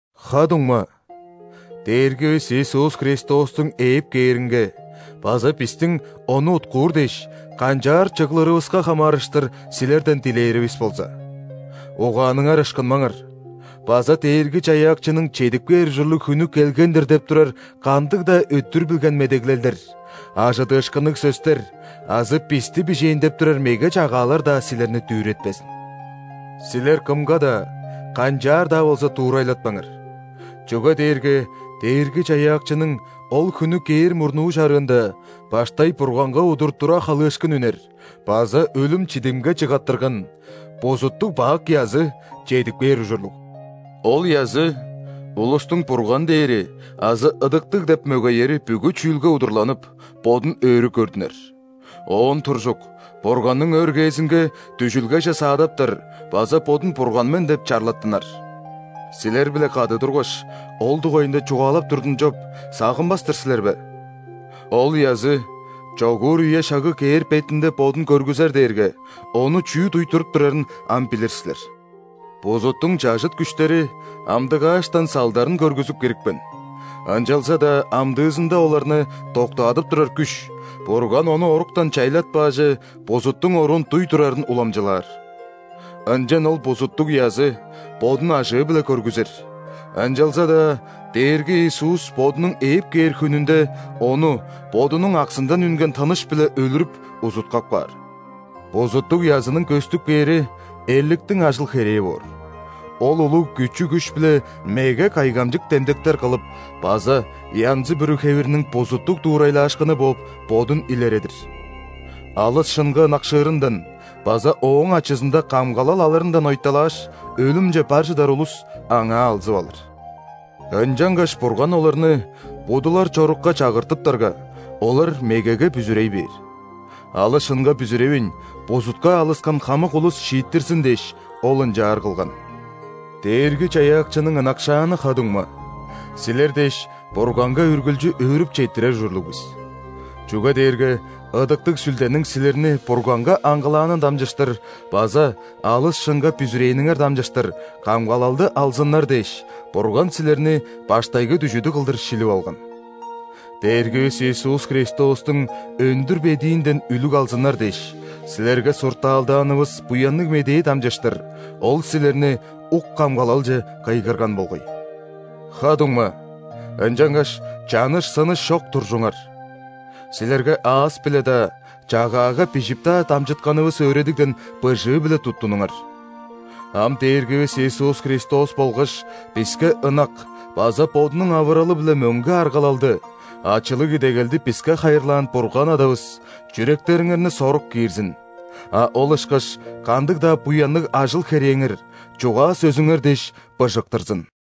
Ха-дуңма, Дээргивис Иисус Христостуң ээп кээринге база бистиң Ону уткуур дээш, канчаар чыглырывыска хамаарыштыр силерден дилээривис болза: угааныңар ышкынмаңар база Дээрги-Чаяакчының чедип кээр ужурлуг хүнү келген-дир деп турар кандыг-даа өттүр билген медеглелдер, ·ажыдыышкынныг сөстер азы бисти бижээн деп турар меге чагаалар-даа силерни дүүретпезин. Силер кымга-даа, канчаар-даа болза дуурайлатпаңар. Чүге дээрге Дээрги-Чаяакчының ол хүнү кээр мурнуу чарыында баштай Бурганга удур тура халыышкын үнер база өлүм-чидимге чыгаттырган, бузуттуг-бак язы чедип кээр ужурлуг. Ол язы улустуң «Бурган» дээри азы ыдыктыг деп мөгеери бүгү чүүлге удурланып, бодун өрү көрдүнер, оон туржук, Бурганның өргээзинге дүжүлгеже саадаптар база бодун «Бурган мен» деп чарлаттынар. Силер-биле кады тургаш, ол дугайында чугаалап турдум чоп, сагынмас-тыр силер бе? Ол язы чогуур үе-шагы кээр бетинде бодун көргүзер дээрге, ону чүү дуй туруп турарын ам билир силер. Бузуттуң чажыт күштери амдыгааштан салдарын көргүзүп кирипкен, ынчалза-даа амдыызында оларны доктаадып турар күш, Бурган ону оруктан чайлатпааже, бузуттуң оруун дуй турарын уламчылаар. Ынчан ол бузуттуг язы бодун ажыы-биле көргүзер, ынчалза-даа Дээрги Иисус Бодунуң ээп кээр хүнүнде ону Бодунуң аксындан үнген тыныш-биле өлүрүп, узуткап каар. Бузуттуг язының көстүп кээри – эрликтиң ажыл-херээ боор – ол улуг күчү-күш-биле меге кайгамчык демдектер кылып база янзы-бүрү хевирниң бузуттуг дуурайлаашкыны бооп, бодун илередир. Алыс шынга ынакшыырындан база ооң ачызында камгалал алырындан ойталааш, өлүмче бар чыдар улус аңаа алзып алыр. Ынчангаш Бурган оларны будулар чорукка чагыртыптарга, олар мегеге бүзүрей бээр. Алыс шынга бүзүревейн, бузутка алыскан хамык улус шииттирзин дээш, Ол ынчаар кылган. Дээрги-Чаяакчының ынакшааны ха-дуңма, силер дээш Бурганга үргүлчү өөрүп четтирер ужурлуг бис! Чүге дээрге Ыдыктыг Сүлдениң силерни Бурганга аңгылаанын дамчыштыр база алыс шынга бүзүрээниңер дамчыштыр камгалалды алзыннар дээш, Бурган силерни баштайгы дүжүдү кылдыр шилип алган. Дээргивис Иисус Христостуң өндүр бедиинден үлүг алзыннар дээш, силерге суртаалдаанывыс Буянныг Медээ дамчыштыр Ол силерни ук камгалалче кыйгырган болгай. Ха-дуңма, ынчангаш чаныш-сыныш чок туржуңар! Силерге аас-биле-даа, чагаага бижип-даа дамчытканывыс өөредигден быжыы-биле туттунуңар. Ам Дээргивис Иисус Христос болгаш биске ынак база Бодунуң авыралы-биле мөңге аргалалды, ачылыг идегелди биске хайырлаан Бурган Адавыс чүректериңерни сорук киирзин, а ол ышкаш кандыг-даа буянныг ажыл-херээңер, чугаа-сөзүңер дээш, быжыктырзын.